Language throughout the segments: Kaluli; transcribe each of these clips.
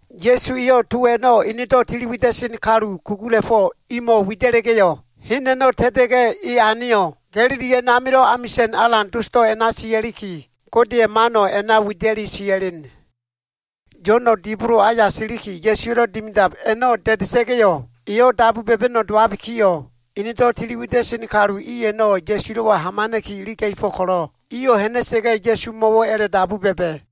Ya꞉su eyo꞉ to a꞉no꞉ enedo꞉ tiliwida꞉sen kalu kugula꞉fo꞉ o꞉mo꞉ wida꞉la꞉ga꞉yo꞉, hen a꞉no꞉ ta꞉ta꞉ga꞉ e aneyo꞉, Galili a꞉namilo꞉ amisa꞉n alan dosdo꞉ a꞉na sia꞉liki, Godeya꞉ mano꞉ a꞉na wida꞉li sia꞉len. Yo꞉no꞉ dibolo aya silikiyo꞉, Ya꞉suwa꞉lo꞉ dimidab a꞉no꞉ da꞉da꞉sa꞉ga꞉yo꞉, eyo꞉ dabu ba꞉ba꞉no꞉ dowabikiyo꞉, enedo꞉ tiliwida꞉sen kalu i a꞉no꞉ Ya꞉sulo꞉wa hamana꞉ki iliga꞉fo꞉ ko꞉lo꞉, iyo꞉ ha꞉na꞉sa꞉ga꞉, Ya꞉sumo꞉wo꞉ a꞉la꞉dabu ba꞉ba꞉,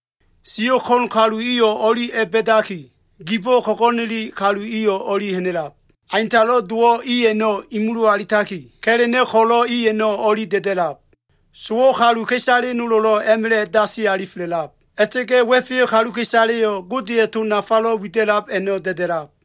Siyo꞉ ko꞉n kalu iyo꞉ o꞉li a꞉ba꞉daki, gibo꞉ ko꞉go꞉neli kalu iyo꞉ o꞉li ha꞉na꞉lab. Aintalo꞉ dowo꞉ i a꞉no꞉ imulu alitaki, ka꞉la꞉no꞉ ko꞉lo꞉ i a꞉no꞉ o꞉li da꞉da꞉lab. Sowo꞉ kaluka꞉isale nolo꞉lo꞉ a꞉ma꞉la꞉ dasi alifela꞉lab. A꞉la꞉ta꞉ga꞉ wa꞉feyo꞉ kaluka꞉isaleyo꞉ Godeya꞉ to nafalo꞉ wida꞉lab a꞉no꞉ da꞉da꞉lab.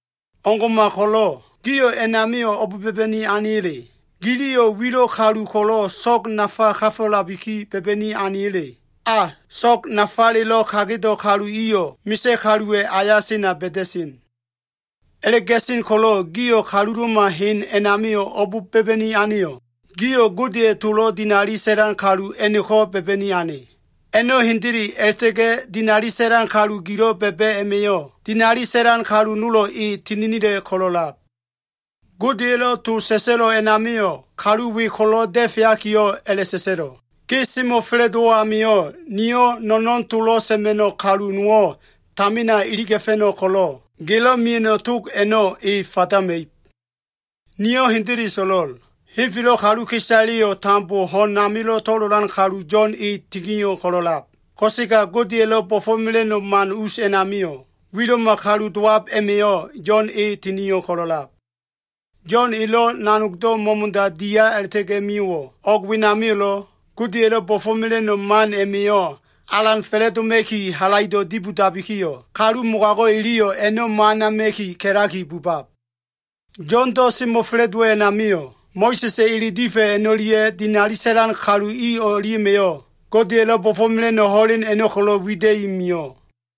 O꞉ngo꞉ma ko꞉lo꞉, gio꞉ a꞉namio꞉ o꞉b ba꞉ba꞉ni aneya꞉le? Giliyo꞉ wilo꞉ kalu ko꞉lo꞉ so꞉g nafa kafo꞉labiki ba꞉ba꞉ni aneya꞉le? A! So꞉g nafalelo꞉ kagedo꞉ kalu iyo꞉ misa꞉ kaluwa꞉ aya sena ba꞉da꞉sen. A꞉la꞉ga꞉sen ko꞉lo꞉, gio꞉ kalulo꞉ma hen a꞉namio꞉ o꞉b ba꞉ba꞉ni aneyo꞉? Gio꞉ Godeya꞉ tolo꞉ dinali sa꞉lan kalu a꞉no꞉ko꞉ ba꞉ba꞉ni ane. A꞉no꞉ hendele, a꞉la꞉ta꞉ga꞉ dinali sa꞉lan kalu gilo꞉ ba꞉ba꞉ a꞉ma꞉yo꞉, dinali sa꞉lan kalu nolo꞉ e tininila꞉ ko꞉lo꞉lab. Godeya꞉lo꞉ to sa꞉sa꞉lo꞉ a꞉namio꞉, kalu we ko꞉lo꞉ da꞉feakiyo꞉ a꞉la꞉sa꞉sa꞉lo꞉, “ ‘Ge semo꞉fa꞉la꞉dowo꞉ amio꞉, niyo꞉ no꞉no꞉n tolo꞉ sa꞉ma꞉no꞉ kalu nowo꞉ tamina iliga꞉fa꞉no꞉ ko꞉lo꞉, gelo꞉ mia꞉no꞉ tog a꞉no꞉ e fadama꞉ib.’ Niyo꞉ hendele so꞉lo꞉l. Henfelo꞉ kaluka꞉isaleyo꞉ tambo ho꞉n amilo꞉ to꞉lolan kalu Yo꞉n e tinio꞉ ko꞉lo꞉lab. Ko꞉sega Godeya꞉lo꞉ bo꞉fo꞉mela꞉no꞉ man us a꞉namio꞉, wilo꞉ma kalu dowab a꞉ma꞉yo꞉ Yo꞉n e tinio꞉ ko꞉lo꞉lab. Yo꞉n elo꞉ nanogdo꞉ mo꞉mo꞉da dia a꞉la꞉ta꞉ga꞉ mio꞉wo꞉, o꞉g wenamio꞉lo꞉, Godeya꞉lo꞉ bo꞉fo꞉mela꞉no꞉ man a꞉ma꞉yo꞉ alan fa꞉la꞉doma꞉ki halaido꞉ dibodabikiyo꞉, kalu mogago꞉ iliyo꞉ a꞉no꞉ mo꞉anama꞉ki ka꞉laki bubab. Yo꞉ndo꞉ semo꞉fa꞉la꞉dowo꞉ a꞉namio꞉, Mo꞉sa꞉sa꞉ ele difa꞉ a꞉no꞉lia꞉ dinali sa꞉lan kalu i o꞉lia꞉ma꞉yo꞉, Godeya꞉lo꞉ bo꞉fo꞉mela꞉no꞉ ho꞉len a꞉no꞉ ko꞉lo꞉ wida꞉i mio꞉.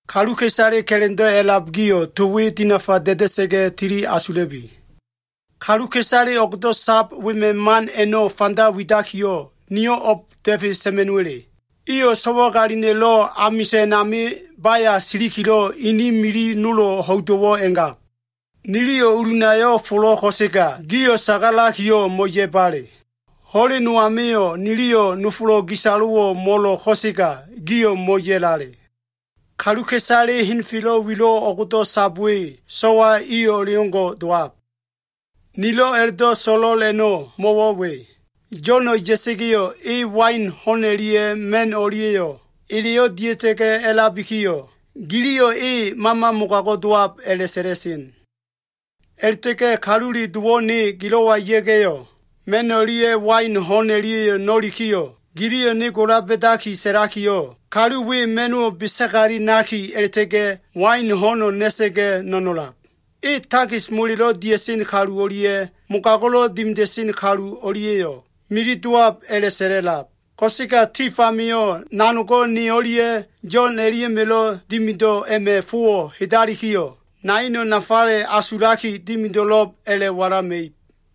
Kaluka꞉isale ka꞉la꞉ndo꞉ a꞉lab gio꞉, to we dinafa da꞉da꞉sa꞉ga꞉ tili asula꞉bi. “Kaluka꞉isale o꞉gdo꞉ sab wema꞉ man a꞉no꞉ fanda widakiyo꞉, niyo꞉ o꞉ba da꞉fe sa꞉ma꞉no꞉wa꞉le? Iyo꞉ so꞉wagalina꞉lo꞉ amisa꞉n ami baya silikilo꞉, ini mili nolo꞉ ho꞉ido꞉wo꞉ a꞉ngab. “ ‘Niliyo꞉ ulunayo꞉ folo꞉, ko꞉sega gio꞉ sagalakiyo꞉ mo꞉ya꞉bale. Ho꞉len no amio꞉ niliyo꞉ nofolo꞉ gisalo꞉wo꞉ mo꞉lo꞉, ko꞉sega gio꞉ mo꞉ya꞉lale.’ Kaluka꞉isale henfelo꞉ wilo꞉ o꞉gdo꞉ sab we so꞉wa i o꞉leo꞉ngo꞉ dowab. Nilo꞉ a꞉la꞉do꞉ so꞉lo꞉l a꞉no꞉ mo꞉wo꞉ we. Yo꞉no꞉ ya꞉sa꞉ga꞉yo꞉, e wain ho꞉n o꞉lia꞉ ma꞉no꞉ o꞉lia꞉yo꞉ eleyo꞉ dia꞉ta꞉ga꞉ a꞉labikiyo꞉, giliyo꞉ ‘E mama mogago꞉ dowab’ a꞉la꞉sa꞉la꞉sen. A꞉la꞉ta꞉ga꞉ Kalule Dowo꞉ ne gilo꞉wa ya꞉ga꞉yo꞉, ma꞉n o꞉lia꞉ wain ho꞉n o꞉lia꞉yo꞉ na꞉lab amio꞉, giliyo꞉ ne gola ba꞉da sa꞉lakiyo꞉, ‘Kalu we ma꞉no꞉wo꞉ besagali naki a꞉la꞉ta꞉ga꞉, wain ho꞉no꞉ na꞉sa꞉ga꞉ no꞉nolab. E takis molelo꞉ dia꞉sen kalu o꞉lia꞉ mogago꞉lo꞉ dimida꞉sen kalu o꞉lia꞉yo꞉ mili dowab’ a꞉la꞉sa꞉la꞉lab. Ko꞉sega tif amio꞉ nanogo꞉ ne o꞉lia꞉ Yo꞉n o꞉lia꞉ma꞉lo꞉ dimido꞉ a꞉ma꞉ fowo꞉ hedalikiyo꞉, naino꞉ nafale asulaki dimido꞉lo꞉b a꞉la꞉walama꞉ib.”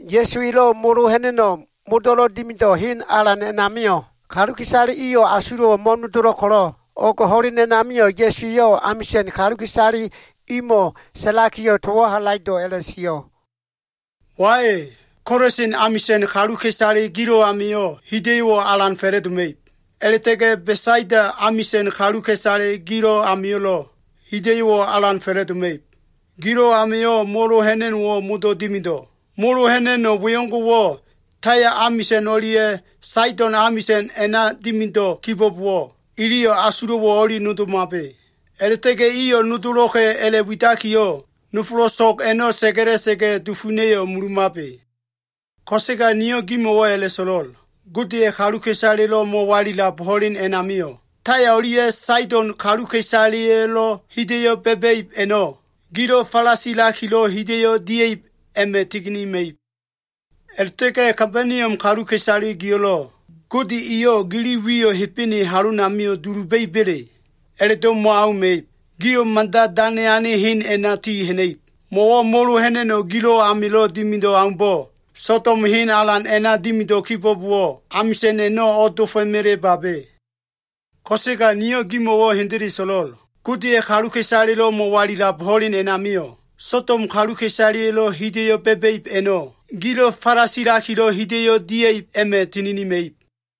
Ya꞉su elo꞉ molo ha꞉na꞉no꞉ modo꞉lo꞉ dimido꞉ hen alan a꞉namio꞉, kaluka꞉isale iyo꞉ asulo꞉wo꞉ mo꞉nodolo꞉ ko꞉lo꞉, o꞉g ho꞉len a꞉namio꞉ Ya꞉su eyo꞉ amisa꞉n kaluka꞉isale imo꞉ sa꞉lakiyo꞉ towo꞉ halaido꞉ a꞉la꞉sio꞉, “Wai, Kolasin amisa꞉n kaluka꞉isale gilo꞉ amio꞉ hida꞉yo꞉wo꞉ alan fa꞉la꞉doma꞉ib. A꞉la꞉ta꞉ga꞉ Besaida amisa꞉n kaluka꞉isale gilo꞉ amio꞉lo꞉ hida꞉yo꞉wo꞉ alan fa꞉la꞉doma꞉ib. Gilo꞉ amio꞉ molo ha꞉na꞉no꞉wo꞉ modo꞉ dimido꞉. Molo ha꞉na꞉no꞉ wengo꞉wo꞉ Taya amisa꞉n o꞉lia꞉ Saido꞉n amisa꞉n a꞉na dimido꞉ kibo꞉bowo꞉, iliyo꞉ asulo꞉wo꞉ o꞉li nodomabe. A꞉la꞉ta꞉ga꞉ iyo꞉ nodolo꞉ka꞉ a꞉la꞉widakiyo꞉ nofolo꞉ so꞉g a꞉no꞉ sa꞉ga꞉la꞉sa꞉ga꞉, dufuna꞉yo꞉ mulumabe. Ko꞉sega niyo꞉ gimo꞉wo꞉ a꞉la꞉so꞉lo꞉l. Godeya꞉ kaluka꞉isalelo꞉ mo꞉walilab ho꞉len a꞉namio꞉, Taya o꞉lia꞉ Saido꞉n kaluka꞉isaleya꞉lo꞉ hida꞉yo꞉ ba꞉ba꞉ib a꞉no꞉, gilo꞉ falasilakilo꞉ hida꞉yo꞉ dia꞉ib a꞉ma꞉ tininima꞉ib. A꞉la꞉ta꞉ga꞉ Kabaniom kaluka꞉isale gio꞉lo꞉, Gode eyo꞉ gili wiyo꞉ Hebene halomio꞉ duluba꞉iba꞉le? A꞉la꞉do꞉ mo꞉auma꞉ib. Gio꞉ mada dane ane hen a꞉na ti ha꞉na꞉ib. Mo꞉wo꞉ molo ha꞉na꞉no꞉ gilo꞉ amilo꞉ dimido꞉ aumbo꞉, Sodom hen alan a꞉na dimido꞉ kibo꞉bowo꞉, amisa꞉n a꞉no꞉ o꞉dofo꞉melebabe. Ko꞉sega niyo꞉ gimo꞉wo꞉ hendele so꞉lo꞉l. Godeya꞉ kaluka꞉isalelo꞉ mo꞉walilab ho꞉len a꞉namio꞉, Sodom kaluka꞉isaleya꞉lo꞉ hida꞉yo꞉ ba꞉ba꞉ib a꞉no꞉, gilo꞉ falasilakilo꞉ hida꞉yo꞉ dia꞉ib a꞉ma꞉ tininima꞉ib.”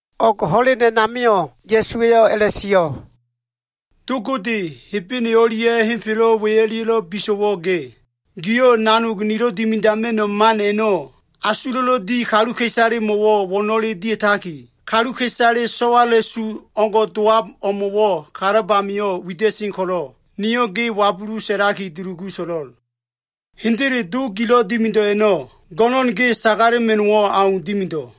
O꞉g ho꞉len a꞉namio꞉ Ya꞉su eyo꞉ a꞉la꞉sio꞉, “Do Gode, Hebene o꞉lia꞉ henfelo꞉ we o꞉lia꞉lo꞉ biso꞉wo꞉ ge. Giyo꞉ nanog nilo꞉ dimida꞉ma꞉no꞉ man a꞉no꞉ asulo꞉lo꞉ di kaluka꞉isalemo꞉wo꞉ wo꞉no꞉le dia꞉taki, kaluka꞉isale so꞉wala꞉su o꞉ngo꞉ dowab o꞉mo꞉wo꞉ kalab amio꞉ wida꞉sen ko꞉lo꞉, niyo꞉ ge wabulu sa꞉laki dulugu so꞉lo꞉l. Hendele Do gilo꞉ dimido꞉ a꞉no꞉, go꞉no꞉n ge sagalema꞉no꞉wo꞉ au dimido꞉.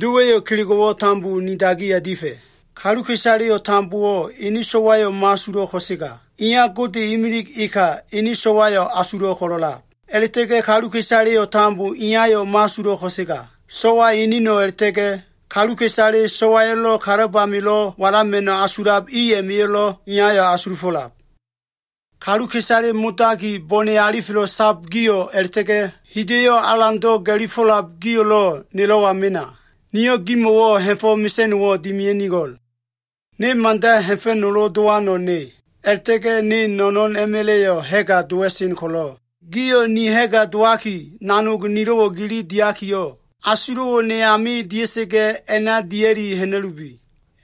Dowa꞉yo꞉ kelego꞉wo꞉ tambo ni dagiya difa꞉. Kaluka꞉isaleyo꞉ tambo ene So꞉wayo꞉ mo꞉asulo꞉ ko꞉sega, Iya Gode imilig eneno꞉ ene So꞉wayo꞉ asulo꞉ ko꞉lo꞉lab. A꞉la꞉ta꞉ga꞉ kaluka꞉isaleyo꞉ tambo Iyayo꞉ mo꞉asulo꞉ ko꞉sega, So꞉wa eneno꞉ a꞉la꞉ta꞉ga꞉ kaluka꞉isale So꞉waya꞉lo꞉ kalab amilo꞉ walama꞉no꞉ asulab i a꞉ma꞉yo꞉lo꞉, Iyayo꞉ asulufo꞉lab. “Kaluka꞉isale modaki bone alifelo꞉ sab gio꞉ a꞉la꞉ta꞉ga꞉ hida꞉yo꞉ alando꞉ ga꞉lifo꞉lab gio꞉lo꞉ nelo꞉wa mena. Niyo꞉ gimo꞉wo꞉ ha꞉fo꞉ mesa꞉no꞉wo꞉ dimia꞉nigo꞉l. Ne mada ha꞉fa꞉nolo dowano꞉ ne, a꞉la꞉ta꞉ga꞉ ne no꞉no꞉n a꞉ma꞉la꞉yo꞉ ha꞉ga dowa꞉sen ko꞉lo꞉, gio꞉ ni ha꞉ga dowaki, nanog nilo꞉wo꞉ gili diakiyo꞉, asulo꞉wo꞉ ne ami dia꞉sa꞉ga꞉ a꞉na dia꞉li ha꞉na꞉lubi.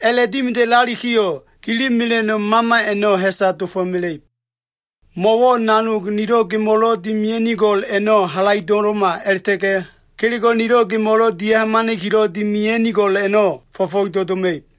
A꞉la꞉dimida꞉lalikiyo꞉, gili mela꞉no꞉ mama a꞉no꞉ ha꞉sa dofo꞉mela꞉ib. Mo꞉wo꞉ nanog nilo꞉ gemo꞉lo꞉ dimia꞉nigo꞉l a꞉no꞉ halaido꞉ma a꞉la꞉ta꞉ga꞉ kelego꞉ nilo꞉ gemo꞉lo꞉ dia꞉hamana꞉kilo꞉ dimia꞉nigo꞉l a꞉no꞉ fo꞉fo꞉ido꞉ doma꞉ib.”